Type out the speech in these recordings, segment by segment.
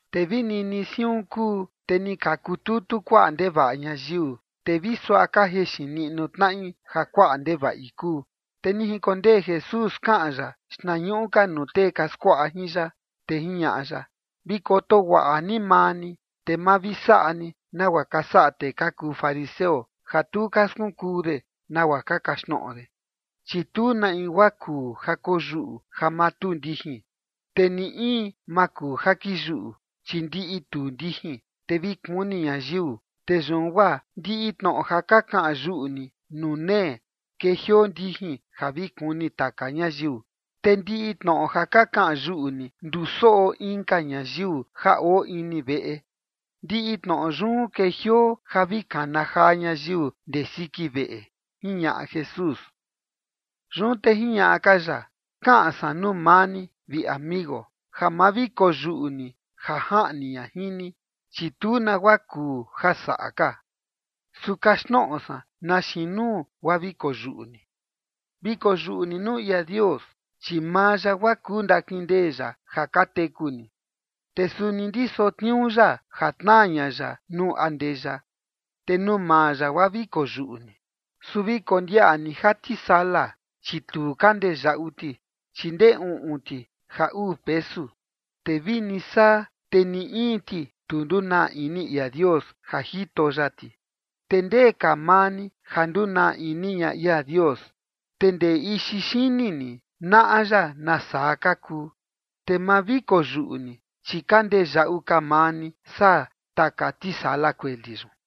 Te vi nini siun kuu, te ni ka kututu kuaꞌa ndevaꞌa ñayiu, te vi suaꞌa ka jexin niꞌnu tnaꞌi ja kuaꞌa ndevaꞌi kuu. Te ni jinkondee Jesús kaꞌan ya xtnañuꞌu ka nuu tee ka skuaꞌa jin ya, te jiñaꞌa ya: ―Vi koto guaꞌa ni maa ni, te ma vi saꞌa ni nagua ka saꞌa tee ka kuu fariseo, ja tu ka skunkuu de nagua ka kaxtnoꞌo de. Chi tu na in guaa kuu ja koyuꞌu ja ma tuu ndijin, te ni in maa kuu ja kiyuꞌu, chi ndiꞌi tuu ndijin, te vi kuni ñayiu. Te yun guaa ndiꞌi tnoꞌo ja ka kaꞌan yuꞌu ni nuu nee, kejioo ndijin ja vi kuni taka ñayiu. Te ndiꞌi tnoꞌo ja ka kaꞌan yuꞌu ni ndusoꞌo inka ñayiu ja oo ini veꞌe, ndiꞌi tnoꞌo yun kejioo ja vi kana jaa ñayiu ndee siki veꞌe ―jiñaꞌa Jesús. Yun te jiñaꞌa ka ya: ―Kaꞌan san nuu maa ni, vi amigo, ja ma vi koyuꞌu ni ja jaꞌni ña jin ni, chi tu nagua kuu ja saꞌa ka. Su kaxtnoꞌo san na xiin nuu guaa vi koyuꞌu ni: Vi koyuꞌu ni nuu ia Dios, chi maa ya guaa kuu ndakindee ya ja ka teku ni, te suni ndiso tniuu ya ja tnaa ña ya nuu andeya. Te nuu maa ya guaa vi koyuꞌu ni. ’Su vi kondiaꞌa ni ja tisala, chi tu ka ndee yaꞌu ti, chi ndee uꞌun ti ja uu pesu. Te vini saa, te ni in ti, tu ndunaa ini ia Dios ja jito ya ti. Te ¿ndee ka maa ni ja ndunaa ini ña ia Dios? Te ndee ixi xini ni naꞌa ya nasaa ka kuu. Te ma vi koyuꞌu ni, chi ka ndee yaꞌu ka maa ni saa taka tisala kueli yun.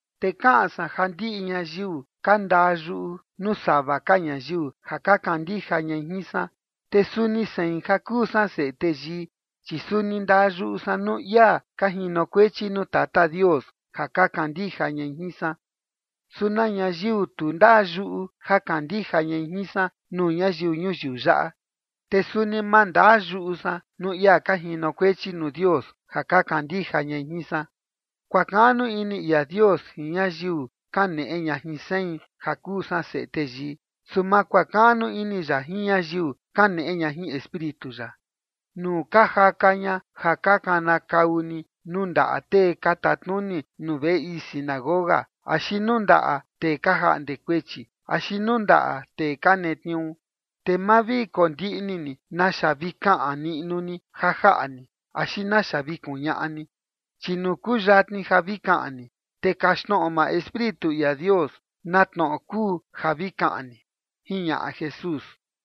’Te kaꞌan san ja ndiꞌi ñayiu ka ndaa yuꞌu nuu sava ka ñayiu ja ka kandija ñai jin san, te suni sein, ja kuu san Seꞌe Teyii, chi suni ndaa yuꞌu san nuu ia ka jinokuechi nuu Tata Dios ja ka kandija ñai jin san. Su na ñayiu tu ndaa yuꞌu ja kandija ñai jin san nuu ñayiu ñuyiu yaꞌa, te suni ma ndaa yuꞌu san nuu ia ka jinokuechi nuu Dios ja ka kandija ñai jin san. Kuakaꞌnu ini ia Dios jin ñayiu kaneꞌe ña jin sein, ja kuu san Seꞌe Teyii, su ma kuakaꞌnu ini ya jin ñayiu kaneꞌe ña jin Espíritu ya. Nuu ka jaka ña ja ka kanakau ni nuu ndaꞌa tee ka tatnuni nuu veꞌe ii sinagoga, axi nuu ndaꞌa tee ka jaꞌnde kuechi, axi nuu ndaꞌa tee ka netniuu, te ma vi kondiꞌni ni naxa vi kaꞌan niꞌnu ni ja jaꞌa ni, axi naxa vi kuñaꞌa ni. Chi nuu kuyatni ja vi kaꞌan ni, te kaxtnoꞌo maa Espíritu ia Dios na tnoꞌo kuu ja vi kaꞌan ni ―jiñaꞌa Jesús.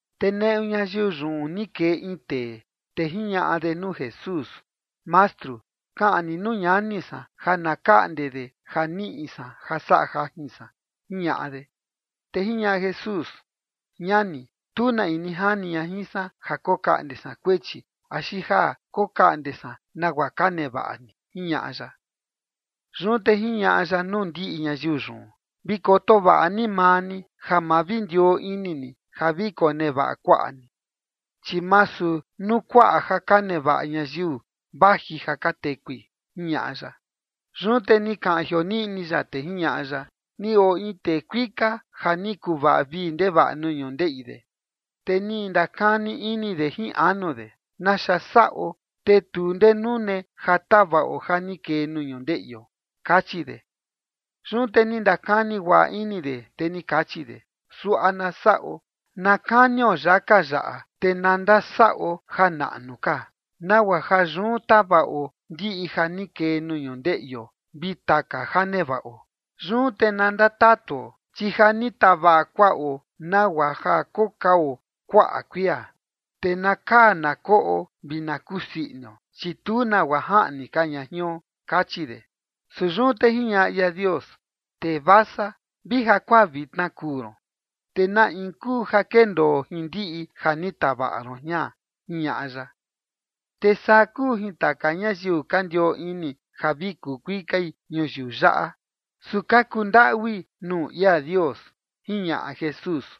Te neꞌu ñayiu yun ni kee in tee, te jiñaꞌa de nuu Jesús: ―Mastru, kaꞌan ni nuu ñani san ja na kaꞌnde de ja niꞌi san ja saꞌa jajin san ―jiñaꞌa de. Te jiñaꞌa Jesús: ―Ñani, tu na in ni jani ña jin san ja kokaꞌnde san kuechi axi ja kokaꞌnde san nagua ka nevaꞌa ni ―jiñaꞌa ya. Yun te jiñaꞌa ya nuu ndiꞌi ñayiu yun: ―Vi koto vaꞌa ni maa ni ja ma vi ndioo ini ni ja vi konevaꞌa kuaꞌa ni, chi masu nuu kuaꞌa ja ka nevaꞌa ñayiu vaji ja ka tekui ―jiñaꞌa ya. Yun te ni kaꞌan jioniꞌni ya, te jiñaꞌa ya: ―Ni oo in tee kuika ja ni kuvaꞌa vii ndevaꞌa nuu ñundeꞌi de. Te ni ndakani ini de jin anu de: “¿Naxa saꞌo, te tu ndee nune ja tavaꞌo ja ni kee nuu ñundeꞌio?” kachi de. Yun te ni ndakani guaꞌa ini de, te ni kachi de: “Suaꞌa na saꞌo: na kanio yaka yaꞌa, te na ndasaꞌo ja naꞌnu ka, nagua ja yun tavaꞌo ndiꞌi ja ni kee nuu ñundeꞌio vi taka ja nevaꞌo. Yun te na ndatatuo, chi ja ni tavaꞌa kuaꞌo nagua ja kokao kuaꞌa kuia, te na kaa na koꞌo vi na kusii inio, chi tu nagua jaꞌni ka ña jion”, kachi de. Su yun te jiñaꞌa ia Dios: “Tee vasa, vi jakuaa vitna kuu ron, te ¿na in kuu ja kendoo jin ndiꞌi ja ni tavaꞌa ron jian?” ―jiñaꞌa ya―. Te saa kuu jin taka ñayiu ka ndioo ini ja vi kuu kuikai ñuyiu yaꞌa, su ka kundaꞌui nuu ia Dios ―jiñaꞌa Jesús.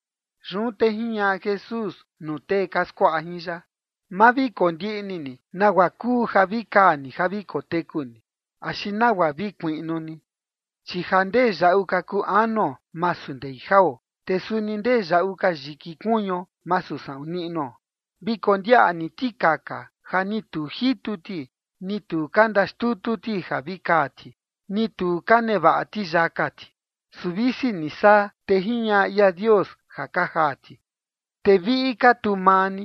Yun te jiñaꞌa Jesús nuu tee ka skuaꞌa jin ya: ―Ma vi kondiꞌni ni nagua kuu ja vi kaa ni ja vi koteku ni, axi nagua vi kuiꞌnu ni. Chi ja ndee yaꞌu ka kuu anuo masu ndei jao, te suni ndee yaꞌu ka yiki kuñuo masu saꞌun niꞌnuo. Vi kondiaꞌa ni tikaka, ja ni tu ka jitu ti, ni tu ka ndaxtutu ti ja vi kaa ti, ni tu ka nevaꞌa ti yaka ti. Su visi ni saa, te jiñaꞌa ia Dios ja ka jaa ti. Te viꞌi ka tu maa ni,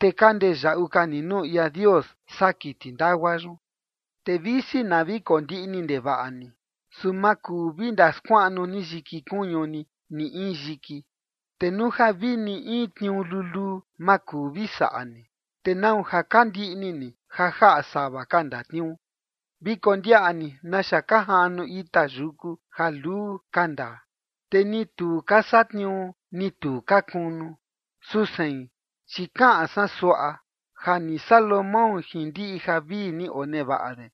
te ka ndee yaꞌu ka ni nuu ia Dios saa kiti ndagua yun. Te visi na vi kondiꞌni ndevaꞌa ni, su ma kuu vi ndaskuaꞌnu ni yiki kuñu ni ni in yiki. Te nuu ja vi ni in tniuu luluu ma kuu vi saꞌa ni, te ¿nau ja ka ndiꞌni ni ja jaꞌa sava ka ndatniuu? ’Vi kondiaꞌa ni naxa ka jaꞌnu ita yuku ja luu ka ndaa, te ni tu ka satniuu, ni tu ka kunu. Su sein chi kaꞌan san suaꞌa: Ja ni Salomón jin ndiꞌi javii ni onevaꞌa de,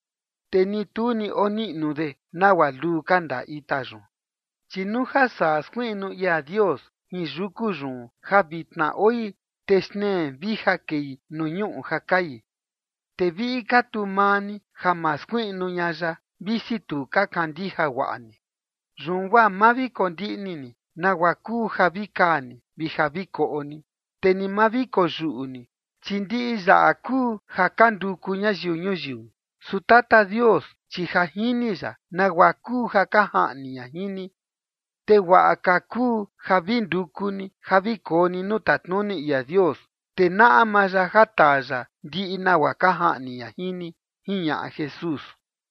te ni tu ni oniꞌnu de nagua luu ka ndaa ita yun. Chi nuu ja saa skuiꞌnu ia Dios jin yuku yun ja vitna oi, te xtnee vija kei nuu ñuꞌu ja kai, te viꞌi ka tu maa ni ja ma skuiꞌnu ña ya, visi tu ka kandija guaꞌa ni. Yun guaa maa vi kondiꞌni ni nagua kuu ja vi kaa ni, vi ja vi koꞌo ni, te ni ma vi koyuꞌu ni. Chi ndiꞌi yaꞌa kuu ja ka nduku ñayiu ñuyiu. Su Tata Dios, chi ja jini ya nagua kuu ja ka jaꞌni ña jin ni. Te guaꞌa ka kuu ja vi nduku ni ja vi koo ni nuu tatnuni ia Dios, te naꞌa maa ya ja taa ya ndiꞌi nagua ka jaꞌni ña jin ni ―jiñaꞌa Jesús.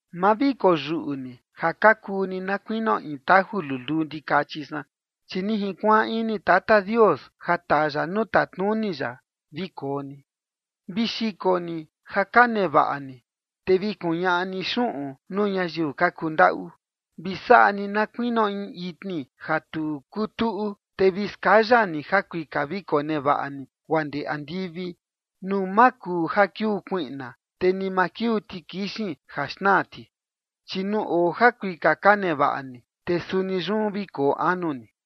’Ma vi koyuꞌu ni, ja ka kuu ni na kuinio in taju luluu ndikachi san, chi ni junkuaan ini Tata Dios ja taa ya nuu tatnuni ya vi koo ni. Vi xiko ni ja ka nevaꞌa ni, te vi kuñaꞌa ni xuꞌun nuu ñayiu ka kundaꞌu. Vi saꞌa ni na kuinio in itni ja tu kuu tuꞌu, te vi skaya ni jakuika vi konevaꞌa ni guaa ndee andivi, nuu ma kuu ja kiuu kuiꞌna, te ni ma kiuu tikixin ja xnaa ti. Chi nuu oo jakuika ka nevaꞌa ni, te suni yun vi koo anu ni.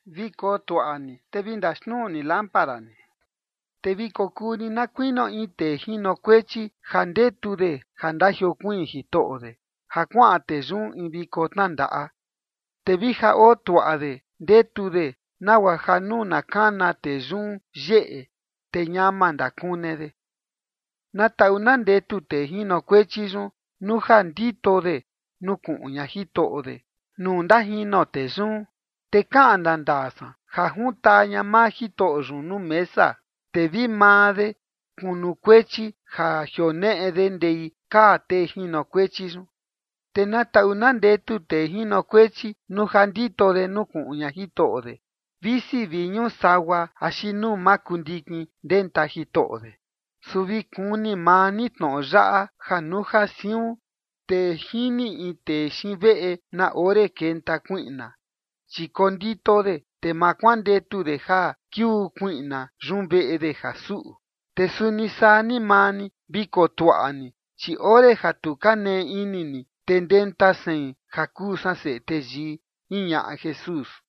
’Vi kotuaꞌa ni, te vi ndaxnuu ni lámpara ni. Te vi kokuu ni na kuinio in tee jinokuechi ja ndetu de ja ndajiokuiin jitoꞌo de, ja kuaꞌan tee yun in viko tnandaꞌa. Te vija oo tuaꞌa de ndetu de nagua ja nuu na kana tee yun yeꞌe, te ñama ndakune de. Na taꞌu na ndetu tee jinokuechi yun nuu ja ndito de nukuꞌun ña jitoꞌo de nuu ndajino tee yun. Te kaꞌan ndandaa san ja juntaa ña maa jitoꞌo yun nuu mesa, te vi maa de kunukuechi ja jioneꞌe de ndei kaa tee jinokuechi yun. Te na taꞌu na ndetu tee jinokuechi nuu ja ndito de nukuꞌun ña jitoꞌo de, visi vi ñuu sagua axi nuu makundikin ndenta jitoꞌo de. Su vi kuni maa ni tnoꞌo yaꞌa: ja nuu ja siun, te jini in tee xiin veꞌe na ore kenta kuiꞌna, chi kondito de, te ma kuandetu de ja kiuu kuiꞌna yun veꞌe de ja suꞌu. Te suni saa ni maa ni, vi kotuaꞌa ni, chi ore ja tu ka nee ini ni, te ndenta sein, ja kuu san Seꞌe Teyii ―jiñaꞌa Jesús.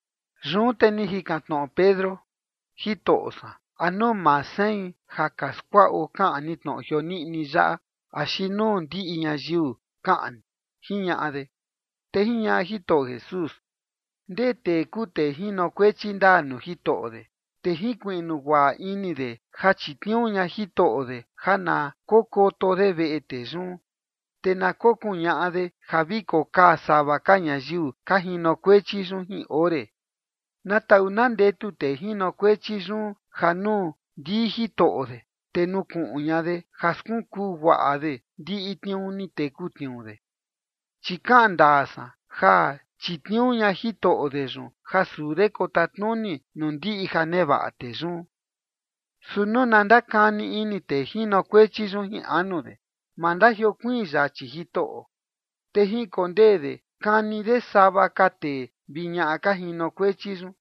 Yun te ni jikan tnoꞌo Pedro: ―Jitoꞌo san, ¿a nuu maa sein ja ka skuaꞌo kaꞌan ni tnoꞌo jioniꞌni yaꞌa, axi nuu ndiꞌi ñayiu kaꞌan ni? ―jiñaꞌa de. Te jiñaꞌa Jitoꞌo Jesús: ―¿Ndee tee kuu tee jinokuechi ndaa nuu jitoꞌo de, te jinkuiꞌnu guaꞌa ini de ja chitniuu ña jitoꞌo de ja na kokoto de veꞌe tee yun, te na kokuñaꞌa de ja vi kokaa sava ka ñayiu ka jinokuechi yun jin ore? Na taꞌu na ndetu tee jinokuechi yun ja nuu ndii jitoꞌo de, te nukuꞌun ña de ja skunkuu guaꞌa de ndiꞌi tniuu ni teku tniuu de. Chi kaꞌan ndaa san ja chitniuu ña jitoꞌo de yun ja suu de kotatnuni nuu ndiꞌi ja nevaꞌa tee yun. Su nuu na ndakani ini tee jinokuechi yun jin anu de: “Ma ndajiokuiin yachi jitoꞌo”, te jinkondee de kani de sava ka tee vi ñaꞌa ka jinokuechi yun,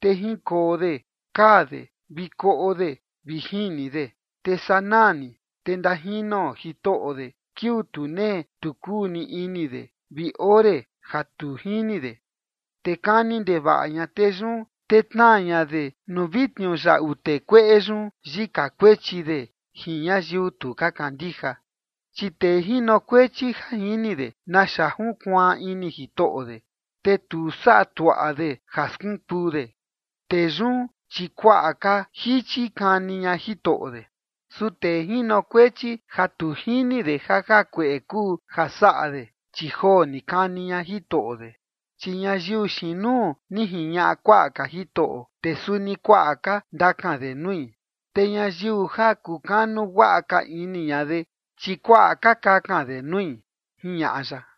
te jinkoo de kaa de vi koꞌo de vi jini de. Te sanaa ni, te ndajino jitoꞌo de kiuu tu nee tu kuu ni ini de vi ore ja tu jini de. Te kani ndevaꞌa ña tee yun, te tnaa ña de nuu vi tniuyaꞌu tee kueꞌe yun yika kuechi de jin ñayiu tu ka kandija. ’Chi tee jinokuechi ja jini de naxa junkuaan ini jitoꞌo de, te tu saꞌa tuaꞌa de ja skunkuu de, tee yun, chi kuaꞌa ka jichi kani ña jitoꞌo de. Su tee jinokuechi ja tu jini de ja jakueꞌe kuu ja saꞌa de, chi joo ni kani ña jitoꞌo de. Chi ñayiu xiin nuu ni jiñaꞌa kuaꞌa ka Jitoꞌo, te suni kuaꞌa ka ndakan de nui. Te ñayiu ja kukanu guaꞌa ka ini ña de, chi kuaꞌa ka kakan de nui ―jiñaꞌa ya.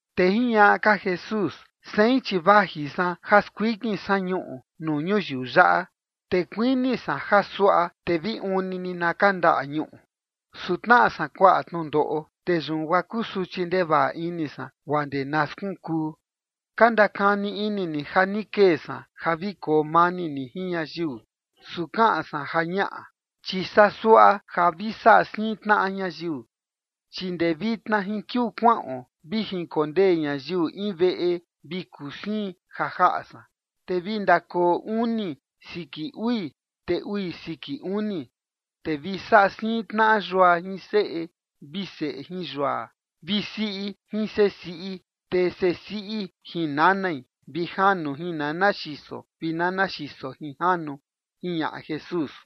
Te jiñaꞌa ka Jesús: ―Sein, chi vaji san ja skuikin san ñuꞌu nuu ñuyiu yaꞌa, te kuini san ja suaꞌa, te vi uun ni ni na kandaꞌa ñuꞌu. Su tnaꞌa san kuaꞌa tnundoꞌo, te yun guaa kusuchi ndevaꞌa ini san, guaa ndee na skunkuu. Ka ndakani ini ni ja ni kee san ja vi koo mani ni jin ñayiu. Su kaꞌan san ja ñaꞌa, chi saa suaꞌa ja vi saꞌa siin tnaꞌa ñayiu. Chi ndee vitna jin kiuu kuaꞌon, vi jinkondee ñayiu in veꞌe vi kuu siin ja jaꞌa san. Te vi ndakoo uni siki ui, te ui siki uni. Te vi saꞌa siin tnaꞌa yua jin seꞌe, vi seꞌe jin yua, vi siꞌi jin seꞌe siꞌi, te seꞌe siꞌi jin nanai, vi janu jin nana xiso, vi nana xiso jin janu ―jiñaꞌa Jesús.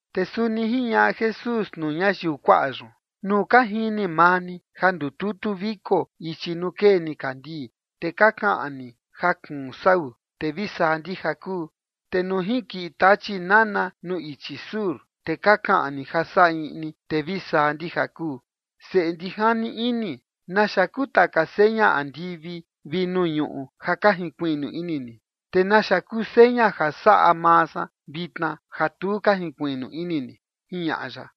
Te suni jiñaꞌa Jesús nuu ñayiu kuaꞌa yun: ―Nuu ka jini maa ni ja ndututu viko ichi nuu kee nikandii, te ka kaꞌan ni ja kuun sau, te vi saa ndija kuu. Te nuu jinkiꞌi tachi nana nuu ichi sur, te ka kaꞌan ni ja saꞌa iꞌni, te vi saa ndija kuu. ¡Seꞌe ndijani ini! ¿Naxa kuu taka seña andivi vi nuu ñuꞌu ja ka jinkuꞌun ini ni, te naxa kuu seña ja saꞌa maa san vitna ja tu ka jinkuiꞌnu ini ni? ―jiñaꞌa ya.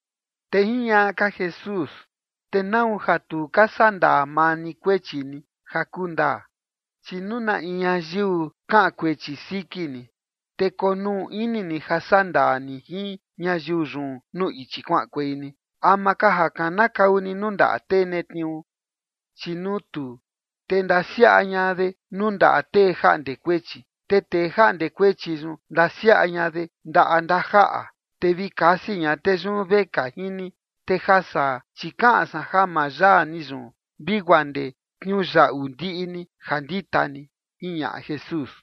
Te jiñaꞌa ka Jesús: ―¿Te nau ja tu ka saꞌa ndaa maa ni kuechi ni ja kuu ndaa? Chi nuu na in ñayiu kaꞌan kuechi siki ni, te konuu ini ni ja saꞌa ndaa ni jin ñayiu yun nuu ichi kuaꞌankuei ni, ama ka ja kanakau ni nuu ndaꞌa tee netniuu. Chi nuu tuu, te ndasiaꞌa ña de nuu ndaꞌa tee jaꞌnde kuechi, te tee jaꞌnde kuechi yun ndasiaꞌa ña de ndaꞌa ndajaꞌa, te vi kasi ña tee yun vekaa jin ni. Te ja saa, chi kaꞌan san ja ma yaa ni yun vi guaa ndee tniuyaꞌu ndiꞌi ni ja ndita ni ―jiñaꞌa Jesús.